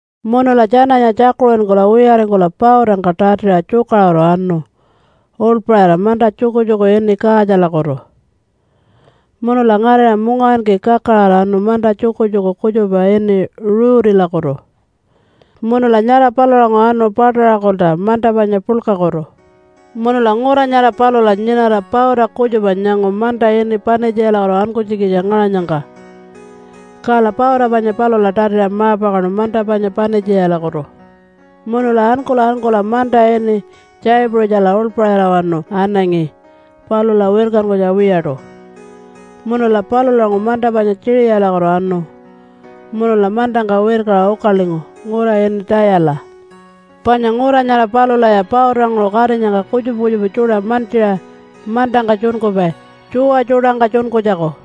Munula tjananya tjakuṟinkula wiyaringkula pautangka tatiṟa tjukaṟuru anu uḻpaṟira manta tjukutjuku ini Kaatjalakutu. Munula ngarira mungawinki kakaraṟa anu manta tjukutjuku kutjupa ini Ruutilakutu, munula nyara palulanguṟu anu Pataṟakulta manta panya puḻkakutu. Munula ngura nyara palula nyinara pauta kutjupa nyangu manta ini Panitjiyalakutu ankunytjikitja ngaṟanyangka. Kala pauta panya palula tatiṟa ma-pakaṉu manta panya Panitjiyalakutu. Munula ankula ankula manta ini Tjaipuṟitjala uḻpaṟirawanu anangi palula wirkankunytja wiyaṯu. Munula palulanguṟu manta panya Tjiṟiyalakutu anu munula mantangka wirkaṟa ukalingu ngura ini Tayala. Panya ngura nyara palulaya pautanguṟu katinyangka kutjupa kutjupa tjuṯa mantjiṟa mantangka tjunkupai tjuwa tjuṯangka tjunkunytjaku.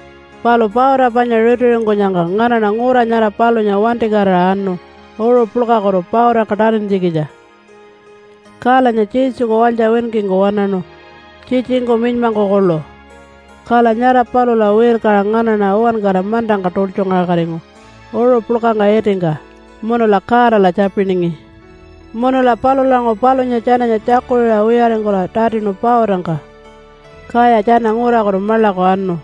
Palu pauta panya ritiringkunyangka nganaṉa ngura nyara palunya wantikatira anu uṟu puḻkakutu pautangka tatintjikitja, kalanya Jesuku walytja winkingku waṉaṉu tjitjingku minymangku kuḻu. Kala nyara palula wirkaṟa nganaṉa uwankara mantangka tultjungaṟakatingu uṟu puḻkangka itingka munula Godala tjapiningi. Munula palulanguṟu palunya tjananya tjakuṟiṟa wiyaringkula tatinu pautangka, kaya tjana ngurakutu maḻaku anu.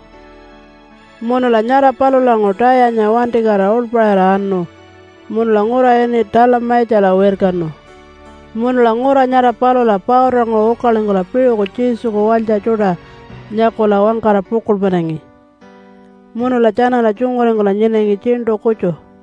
Munula nyara palulanguṟu Tayanya wantikatira uḻpaṟira anu munula ngura ini Talamaitjala wirkanu. Munula ngura nyara palula pautanguṟu ukalingkula piṟuku Jesuku walytja tjuṯa nyakula wangkara pukuḻmanangi munula tjanala tjunguringkula nyinangi tjiṉṯu kutju.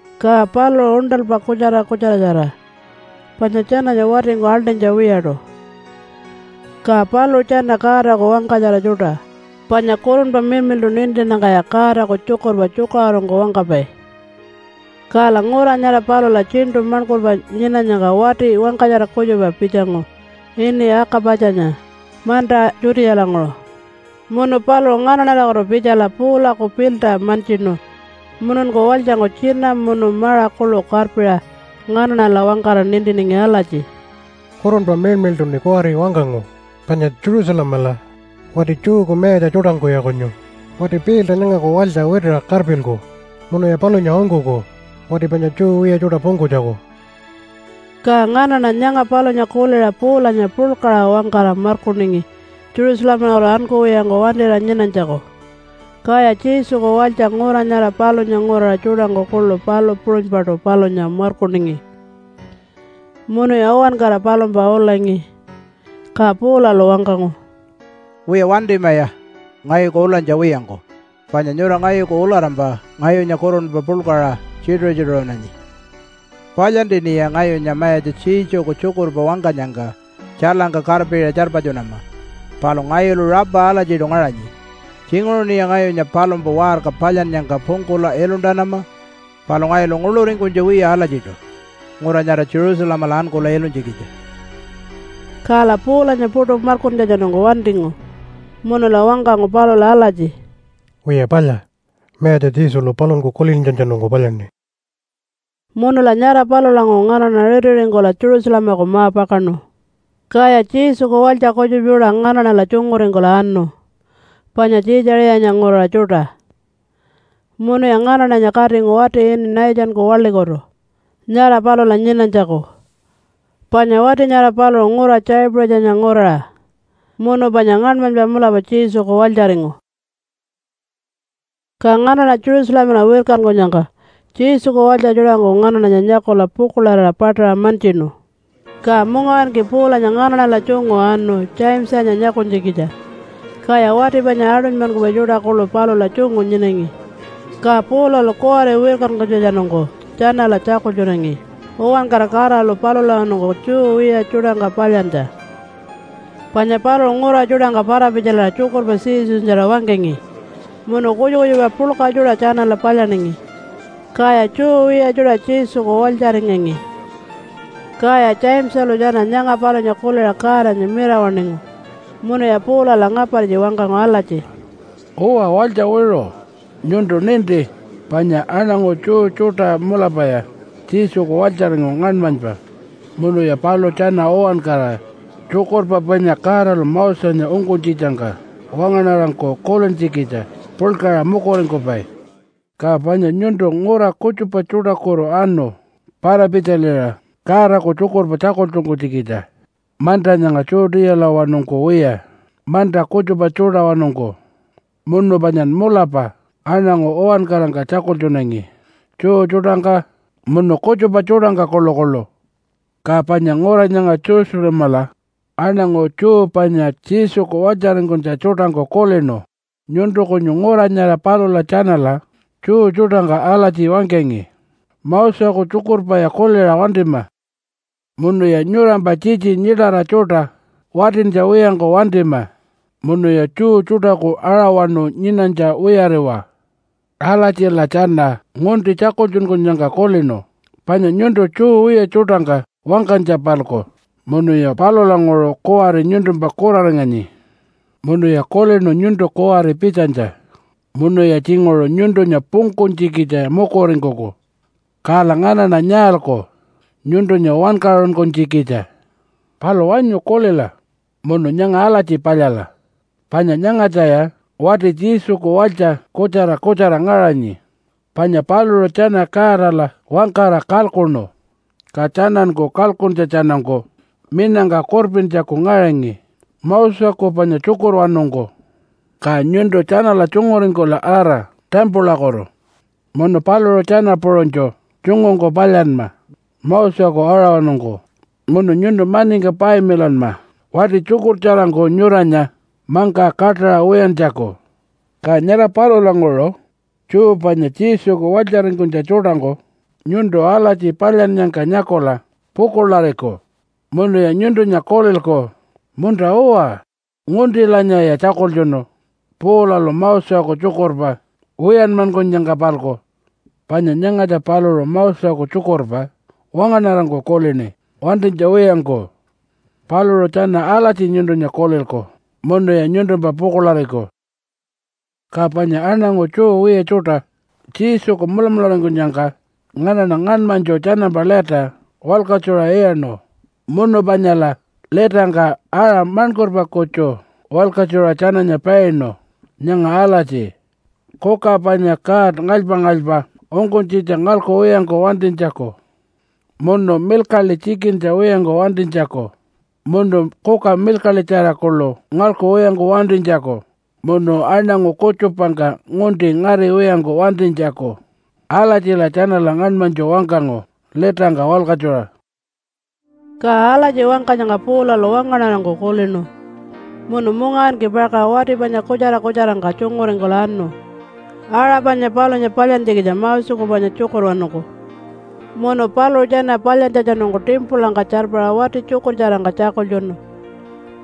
Ka paluṟu uṉṯalpa kutjara kutjaratjara panya tjananya watingku aḻṯinytja wiyaṯu. Ka paluṟu tjana Godaku wangkatjara tjuṯa, panya Kurunpa Miḻmiḻṯu nintinnyangkaya Godaku tjukurpa tjukaṟurungku wangkapai. Kala ngura nyara palula tjiṉṯu maṉkurpa nyinanyangka wati wangkatjara kutjupa pitjangu ini Aka-patjanya manta Judealanguṟu. Munu paluṟu nganaṉalakutu pitjala Paulaku pilta mantjinu mununku walytjangku tjina munu maṟa kuḻu karpiṟa nganaṉala wangkara nintiningi alatji, “Kurunpa Miḻmiḻṯuṉi kuwari wangkangu panya Jerusalemala wati Jewku mayatja tjuṯangkuya kunyu wati pilta nyangaku walytja witiṟa karpilku munuya palunya ungkuku wati panya Jew wiya tjuṯa pungkunytjaku.” Ka nganaṉa nyanga palunya kuliṟa Paulanya puḻkaṟa wangkara markuningi Jerusalemalakutu ankuwiyangku wantira nyinanytjaku. Kaya Jesuku walytja ngura nyara palunya nguraṟa tjuṯangku kuḻu palu puṟunypaṯu palunya markuningi. Munuya uwankara palumpa ulangi. Ka Paulalu wangkangu, “Wiya, wantimaya ngayuku ulanytja wiyangku, panya nyura ngayuku ularampa ngayunya kurunpa puḻkaṟa tjituṟu-tjituṟunanyi. Palyantiṉiya ngayunya Mayatja Jesuku tjukurpa wangkanyangka tjailangka karpiṟa tjarpatjunama, palu ngayulu rapa alatjiṯu ngaṟanyi. Tjinguṟuṉiya ngayunya palumpa waṟka palyannyangka pungkula iluntanama, palu ngayulu nguḻuringkunytja wiya alatjiṯu ngura nyara Jerusalemala ankula ilunytjikitja.” Kala Paulanya puṯu markuntjatjanungku wantingu, munula wangkangu palula alatji, “Wiya palya, Mayatja Jesulu paluṟunku kulintjatjanungku palyaṉi.” Munula nyara palulanguṟu nganaṉa ritiringkula Jerusalemaku ma-pakaṉu. Kaya Jesuku walytja kutjupa tjuṯa nganaṉala tjunguringkula anu, panya Tjiitjaṟiyanya nguraṟa tjuṯa, munuya nganaṉanya katingu wati ini Nathanku waḻikutu nyara palula nyinanytjaku. Panya wati nyara paluṟu ngura Tjaipuṟitjanya nguraṟa munu panya ngaṉmanypa mulapa Jesuku walytjaringu. Ka nganaṉa Jerusalemala wirkankunyangka Jesuku walytja tjuṯangku nganaṉanya nyakula pukuḻarira paṯaṟa mantjinu. Ka mungawinki Paulanya nganaṉala tjungu anu Jamesanya nyakunytjikitja, kaya wati panya aṯunymankupai tjuṯa kuḻu palula tjungu nyinangi. Ka Paulalu kuwari wirkankunytjatjanungku tjanala tjakultjunangi uwankara Godalu palulawanungku Jew wiya tjuṯangka palyantja, panya paluṟu ngura tjuṯangka para-pitjaliṟa tjukurpa Jesunyatjara wangkangi, munu kutjupa kutjupa puḻka tjuṯa tjanala palyaningi, kaya Jew wiya tjuṯa Jesuku walytjaringangi. Kaya Jamesalu tjana nyanga palunya kuliṟa Godanya mirawaṉingu munuya Paulala ngapartji wangkangu alatji, “Uwa, walytja wiṟu! Nyuntu ninti panya aṉangu Jew tjuṯa mulapaya Jesuku walytjaringu ngaṉmanypa munuya paluṟu tjana uwankara tjukurpa panya Godalu Mosenya ungkunytjitjangka wangaṉarangku kulintjikitja puḻkaṟa mukuringkupai. Ka panya nyuntu ngura kutjupa tjuṯakutu anu para-pitjaliṟa Godaku tjukurpa tjakultjunkunytjikitja manta nyanga Judealawanungku wiya manta kutjupa tjuṯawanungku. Munu panyan mulapa aṉangu uwankarangka tjakultjunangi Jew tjuṯangka munu kutjupa tjuṯangka kuḻukuḻu. Ka panya ngura nyanga Jerusalemala aṉangu Jew panya Jesuku walytjaringkunytja tjuṯangku kulinu nyuntu kunyu ngura nyara palula tjanala Jew tjuṯangka alatji wangkangi, ‘Moseku tjukurpaya kuliṟa wantima munuya nyurampa tjitji nyiṯayira tjuṯa watintja wiyangku wantima. Munuya Jew tjuṯaku aṟawanu nyinanytja wiyariwa.’ Alatjila tjana ngunti tjakultjunkunyangka kulinu panya nyuntu Jew wiya tjuṯangka wangkanytja-palku, munuya palulanguṟu kuwari nyuntumpa kuraringanyi. Munuya kulinu nyuntu kuwari pitjanytja munuya tjinguṟu nyuntunya pungkunytjikitja mukuringkuku. Kala nganaṉa nyaalku nyuntunya wankaṟunkunytjikitja? Palu wanyu kulila, munu nyanga alatji palyala! Panya nyangatjaya wati Jesuku walytja kutjara kutjara ngaṟanyi, panya paluṟu tjana Godala wangkara kalkuṉu, ka tjananku kalkuntjatjanungku minangka kurpintjaku ngaṟanyi Moseku panya tjukurwanungku. Ka nyuntu tjanala tjunguringkula ara timpulakutu munu paluṟu tjana puṟunytju tjungungku palyanma Moseku aṟawanungku. Munu nyuntu maningka payamilanma wati tjukurtjarangku nyuranya mangka kaṯaṟa wiyantjaku. Ka nyara palulanguṟu Jew panya Jesuku walytjaringkunytja tjuṯangku nyuntu alatji palyannyangka nyakula pukuḻariku munuya nyuntunya kulilku, ‘Munta-uwa! Nguntilanyaya tjakultjunu Paulalu Moseku tjukurpa wiyanmankunyangka-palku. Panya nyangatja paluṟu Moseku tjukurpa wangaṉarangku kulini wantinytja wiyangku.’ Paluṟu tjana alatji nyuntunya kulilku munuya nyuntumpa pukuḻariku. “Ka panya aṉangu Jew wiya tjuṯa Jesuku mulamularingkunyangka nganaṉa ngaṉmanytju tjanampa lita walkatjuṟa iyaṉu munu panyala litangka aṟa maṉkurpa kutju walkatjuṟa tjananya painu nyanga alatji, kuka panya god ngalypa-ngalypa ungkunytjitja ngalkuwiyangku wantinytjaku, munu milkaḻi tjikintja wiyangku wantinytjaku, munu kuka milkaḻitjara kuḻu ngalkuwiyangku wantinytjaku, munu aṉangu kutjupangka ngunti ngariwiyangku wantinytjaku. Alatjila tjanala ngaṉmanytju wangkangu litangka walkatjuṟa.” Ka alatji wangkanyangka Paulalu wangaṉarangku kulinu munu mungawinki pakaṟa wati panya kutjara kutjarangka tjunguringkula anu aṟa panya palunya palyantjikitja Moseku panya tjukurwanungku. Munu paluṟu tjana palyantjatjanungku timpulangka tjarpara wati tjukurtjarangka tjakultjunu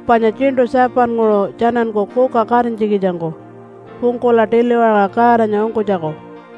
panya tjiṉṯu 7-nguṟu tjananku kuka katinytjikitjangku pungkula tiliwakaṟa Godanya ungkunytjaku.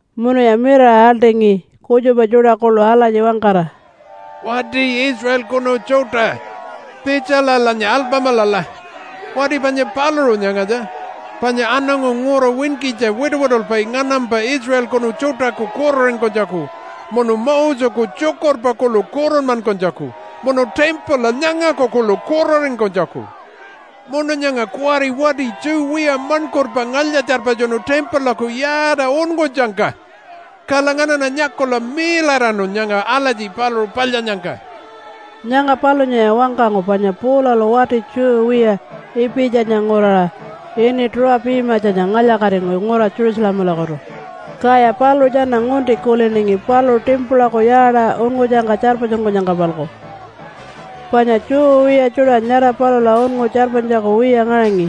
Munuya mirara aḻṯingi kutjupa tjuṯa kuḻu alatji wangkara, “Wati Israelkunu tjuṯa! Pitjalalanya alpamilala! Wati panya paluṟu nyangatja, panya aṉangu ngura winkitja wituwitulpai nganampa Israelkunu tjuṯaku kuraringkunytjaku, munu Moseku tjukurpa kuḻu kuranmankunytjaku munu timpula nyangaku kuḻu kuraringkunytjaku. Munu nyanga kuwari wati Jew wiya maṉkurpa ngalya-tjarpatjunu timpulaku yaata unngutjangka, kala nganaṉa nyakula miiḻaraṉu nyanga alatji paluṟu palyannyangka.” (Nyanga palunyaya wangkangu panya Paulalu wati Jew wiya Ipitjanya nguraṟa ini Tuṟu-pimatjanya ngalya-katingu ngura Jerusalemalakutu, kaya paluṟu tjana ngunti kuliningi paluṟu timpulaku yaata unngutjangka tjarpatjunkunyangka-palku, panya Jew wiya tjuṯa nyara palula unngu tjarpanytjaku wiya ngaṟangi.)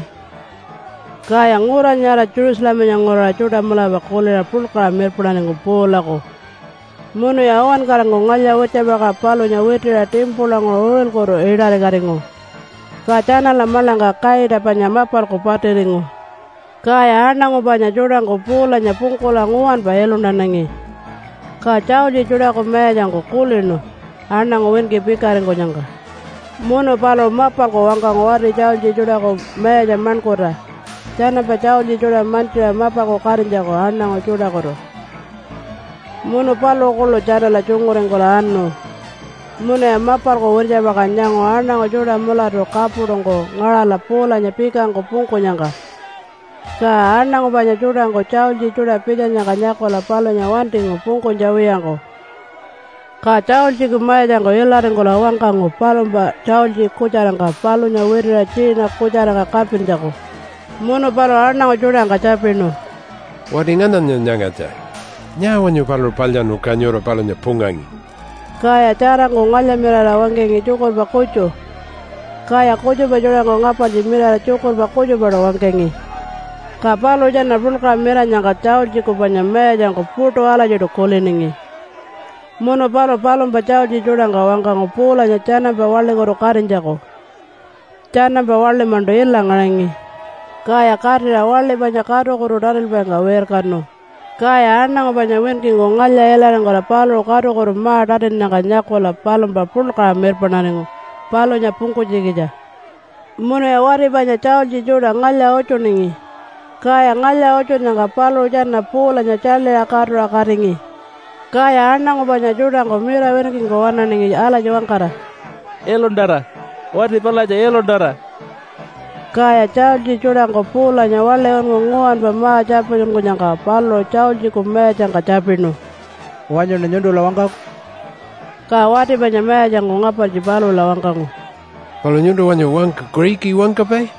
Kaya ngura nyara Jerusalemanya nguraṟa tjuṯa mulapa kuliṟa puḻkaṟa mirpaṉaringu Paulaku munuya uwankarangku ngalya-wirtjapakaṟa palunya witiṟa timpulanguṟu uṟilkutu iṯarikatingu, ka tjanala maḻangka kaita panya mapalku patiringu. Kaya aṉangu panya tjuṯangku Paulanya pungkula nguwanpa iluntanangi, ka tjaultji tjuṯaku mayatjangku kulinu aṉangu winki pikaringkunyangka. Munu paluṟu mapalku wangkangu wati tjaultji tjuṯaku mayatja maṉkurta tjanampa tjaultji tjuṯa mantjiṟa mapalku katinytjaku aṉangu tjuṯakutu munu paluṟu kuḻu tjanala tjunguringkula anu. Munuya mapalku wirtjapakaṟa nyangu aṉangu tjuṯa mulatu kapuṯungku ngaṟala Paulanya pikangku pungkunyangka. Ka aṉangu panya tjuṯangku tjaultji tjuṯa pitjanyangka nyakula palunya wantingu pungkunytja wiyangku. Ka tjaultjiku mayatjangku ilaringkula wangkangu palumpa tjaultji kutjarangka palunya witiṟa tjiina kutjarangka karpintjaku. Munu paluṟu aṉangu tjuṯangka tjapinu, “Wati ngananya nyangatja? Nyaa wanyu paluṟu palyaṉu, ka nyura palunya pungangi?” Kaya tjarangku ngalya-mirara wangkangi tjukurpa kutju, kaya kutjupa tjuṯangku ngapartji mirara tjukurpa kutjupaṯu wangkangi. Ka paluṟu tjana puḻkaṟa miranyangka tjaultjiku panya mayatjangku puṯu alatjiṯu kuliningi, munu paluṟu palumpa tjaultji tjuṯangka wangkangu Paulanya tjanampa waḻikutu katinytjaku. Tjanampa waḻi-maṉṯu ila ngaṟangi. Kaya katira waḻi panya katukutu tatilpaingka wirkanu, kaya aṉangu panya winkingku ngalya-ilaringkula paluṟu katukutu ma-tatinnyangka nyakula palumpa puḻkaṟa mirpaṉaringu palunya pungkunytjikitja munuya wati panya tjaultji tjuṯa ngalya-utjuningi, kaya ngalya-utjunnyangka paluṟu tjana Paulanya tjaḻiṟa katuṟa katingi. Kaya aṉangu panya tjuṯangku mira winkingku waṉaningi alatji wangkara, “Iluntara! Wati palatja iluntara!” Kaya tjaultji tjuṯangku Paulanya waḻi unngu nguwanpa ma-tjarpatjunkunyangka paluṟu tjaultjiku mayatjangka tjapinu, “Wanyuṉa nyuntula wangkaku?” Ka wati panya mayatjangku ngapartji palula wangkangu, “Palu nyuntu wanyu wangka Kuṟiki wangkapai?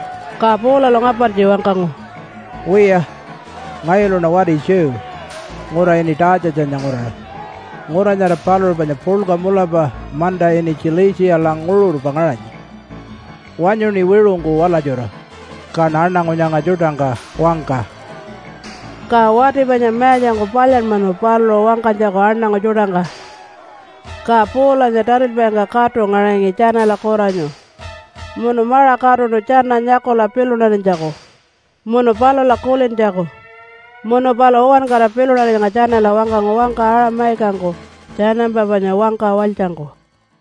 Ka Paulalu ngapartji wangkangu, “Wiya, ngayuluṉa wati Jew, ngura ini Tatjatjanya nguraṟa. Ngura nyara paluṟu panya puḻka mulapa manta ini Tjilitjiyala nguṟurpa ngaṟanyi. Wanyuṉi wiṟungku walatjura, kaṉa aṉangu nyanga tjuṯangka wangka!” Ka wati panya mayatjangku palyanmanu paluṟu wangkanytjaku aṉangu tjuṯangka. Ka Paulanya tatilpaingka katu ngaṟangi tjanala kuranyu munu maṟa katuṉu tjana nyakula pilunarinytjaku munu palula kulintjaku. Munu paluṟu uwankara pilunarinyangka tjanala wangkangu wangka Aṟa-mayikangku tjanampa panya wangka walytjangku.